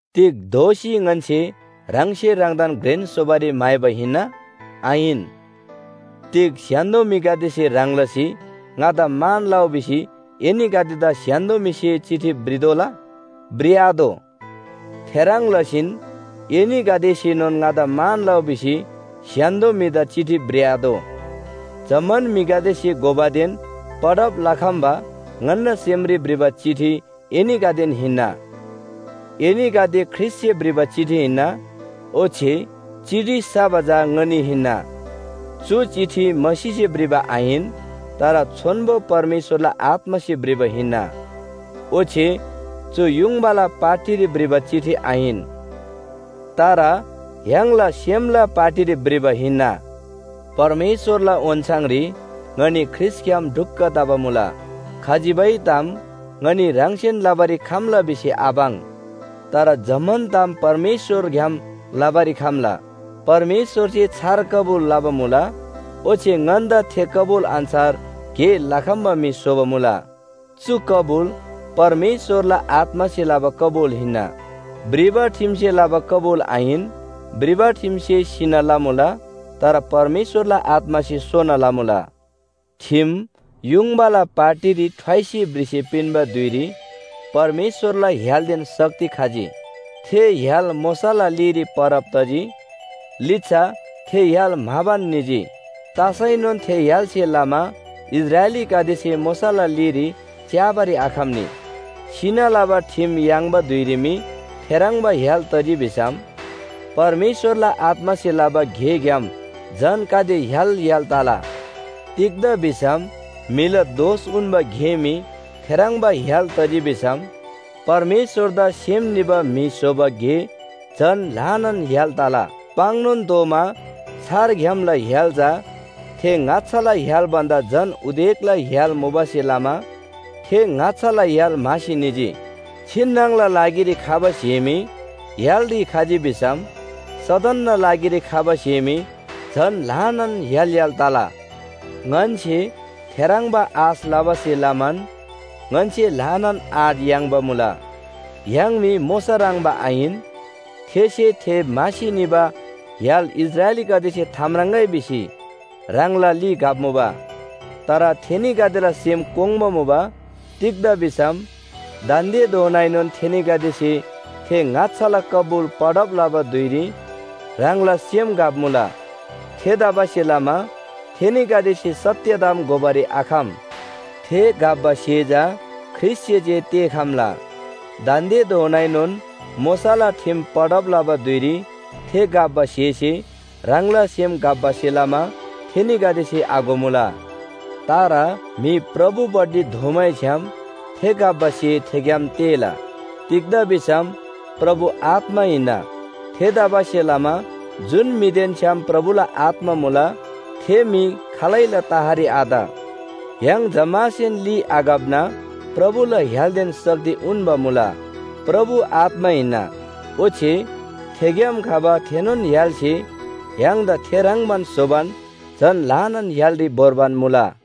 तिग दोःसी ङन्‍से ह्राङसे ह्राङदान घ्रेन स्‍होबारी म्‍हाइबा हिन्‍ना? आहिन। तिग स्‍य्‍हान्‍दो म्‍हिगदेसे ह्रङ् लसी ङादा मान लउ भिसी एनीगदेदा स्‍य्‍हान्‍दो म्‍हिसे चिठी भ्रितोःला? भ्रिआतोः। थेह्रङ् लसीन एनीगदेसेनोन ङादा मान लउ भिसी स्‍य्‍हान्‍दो म्‍हिदा चिठी भ्रिआतोः। जम्‍मान म्‍हिगदेसे घोबादेन पढब लखम्‍बा ङन्‍ना सेमरी भ्रिबा चिठी एनीगदेन हिन्‍ना। एनीगदे ख्रीष्‍टसे भ्रिबा चिठी हिन्‍ना, ओच्‍छे चिठी सबा चा ङनी हिन्‍ना। चु चिठी मसीसे भ्रिबा आहिन, तर छोन्‍बो परमेश्‍वरला आत्‍मासे भ्रिबा हिन्‍ना। ओच्‍छे चु युङबाला पाटीरी भ्रिबा चिठी आहिन, तर य्‍हाङला सेमला पाटीरी भ्रिबा हिन्‍ना। परमेश्‍वरला ओन्‍छाङरी ङनी ख्रीष्‍टग्‍याम ढुक्‍क तबा मुला। खजिबै ताम ङनी ह्राङसेन लबारी खम्‍ला भिसी आपाङ्, तर जम्‍मान ताम परमेश्‍वरग्‍याम लबारी खम्‍ला। परमेश्‍वरसे छार कबुल लबा मुला ओच्‍छे ङन्‍दा थे कबुल अन्‍छार गे लखम्‍बा म्‍हि स्‍होबा मुला। चु कबुल परमेश्‍वरला आत्‍मासे लबा कबुल हिन्‍ना, भ्रिबा ठिमसे लबा कबुल आहिन। भ्रिबा ठिमसे सिना लमुला, तर परमेश्‍वरला आत्‍मासे सोना लमुला। ठिम युङबाला पाटीरी ठ्वाइसी भ्रिसी पिन्‍बा धुइरी परमेश्‍वरला य्‍हालदेन शक्ति खजी। थे य्‍हाल मोशाला लीरी परब तजी, लिच्‍छा थे य्‍हाल म्‍हाबान निजी। तसैनोन थे य्‍हालसे लमा इस्राएलीगदेसे मोशाला लीरी च्‍याबारी आखम्‍नी। सिना लबा ठिम याङ्बा धुइरी मी थेह्रङ्बा य्‍हाल तजी भिसम परमेश्‍वरला आत्‍मासे लबा गेग्‍याम झन गाते य्‍हाल य्‍हाल तला। तिग्‍दा भिसम म्‍हिला दोष उन्‍बा गे मी थेह्रङ्बा य्‍हाल तजी भिसम परमेश्‍वरदा सेम निबा म्‍हि स्‍होबा गे झन ल्‍हानान य्‍हाल तला। पाङ्‌नोन तोःमा छार ग्‍यामला य्‍हाल चा थे ङाच्‍छाला य्‍हाल भन्‍दा झन उदेकला य्‍हाल मुबासे लमा थे ङाच्‍छाला य्‍हाल म्‍हासी निजी। छिन्‍नङला लागिरी खबा स्‍हे मी य्‍हालरी खजी भिसम सदनना लागिरी खबा स्‍हे मी झन ल्‍हानान य्‍हाल य्‍हाल तला। ङन्‍से थेह्रङ्बा आश लबासे लमान ङन्‍से ल्‍हानान आँट याङ्बा मुला। य्‍हाङ मी मोशा ह्रङ्‌बा आहिन, थेसे थे म्‍हासी निबा य्‍हाल इस्राएलीगदेसे थाम्राङ्‍गै भिसी ह्राङला ली घप्‍मुबा। तर थेनीगदेला सेम कोङ्बा मुबा, तिग्‍दा भिसम दान्‍देधोनाएनोन थेनीगदेसे थे ङाच्‍छाला कबुल पढब लबा धुइरी ह्राङला सेम घप्‍मुला। थेतबासेलमा थेनीगदेसे सत्‍य ताम घोबारी आखम। थे घप्‍बा स्‍हे चा ख्रीष्‍टसे जे तेःखम्‍ला। दान्‍देधोनाएनोन मोशाला ठिम पढब लबा धुइरी थे घप्‍बा स्‍हेसे ह्राङला सेम घप्‍बासे लमा थेनीगदेसे आघोमुला। तर म्‍हि प्रभुपट्टि दोःमैछ्‌याम थे घप्‍बा स्‍हे थेग्‍याम तेःला। तिग्‍दा भिसम प्रभु आत्‍मा हिन्‍ना। थेतबासेलमा जुन म्‍हिदेन छ्‌याम प्रभुला आत्‍मा मुला थे म्‍हि खालैला तहरी आत। य्‍हाङ जम्‍मासेन ली आघप्‍ना प्रभुला य्‍हालदेन शक्ति उन्‍बा मुला। प्रभु आत्‍मा हिन्‍ना, ओच्‍छे थेग्‍याम खबा थेनोन य्‍हालसे य्‍हाङदा थे ह्रङ्‌बान स्‍होबान झन ल्‍हानान य्‍हालरी भोर्बान मुला।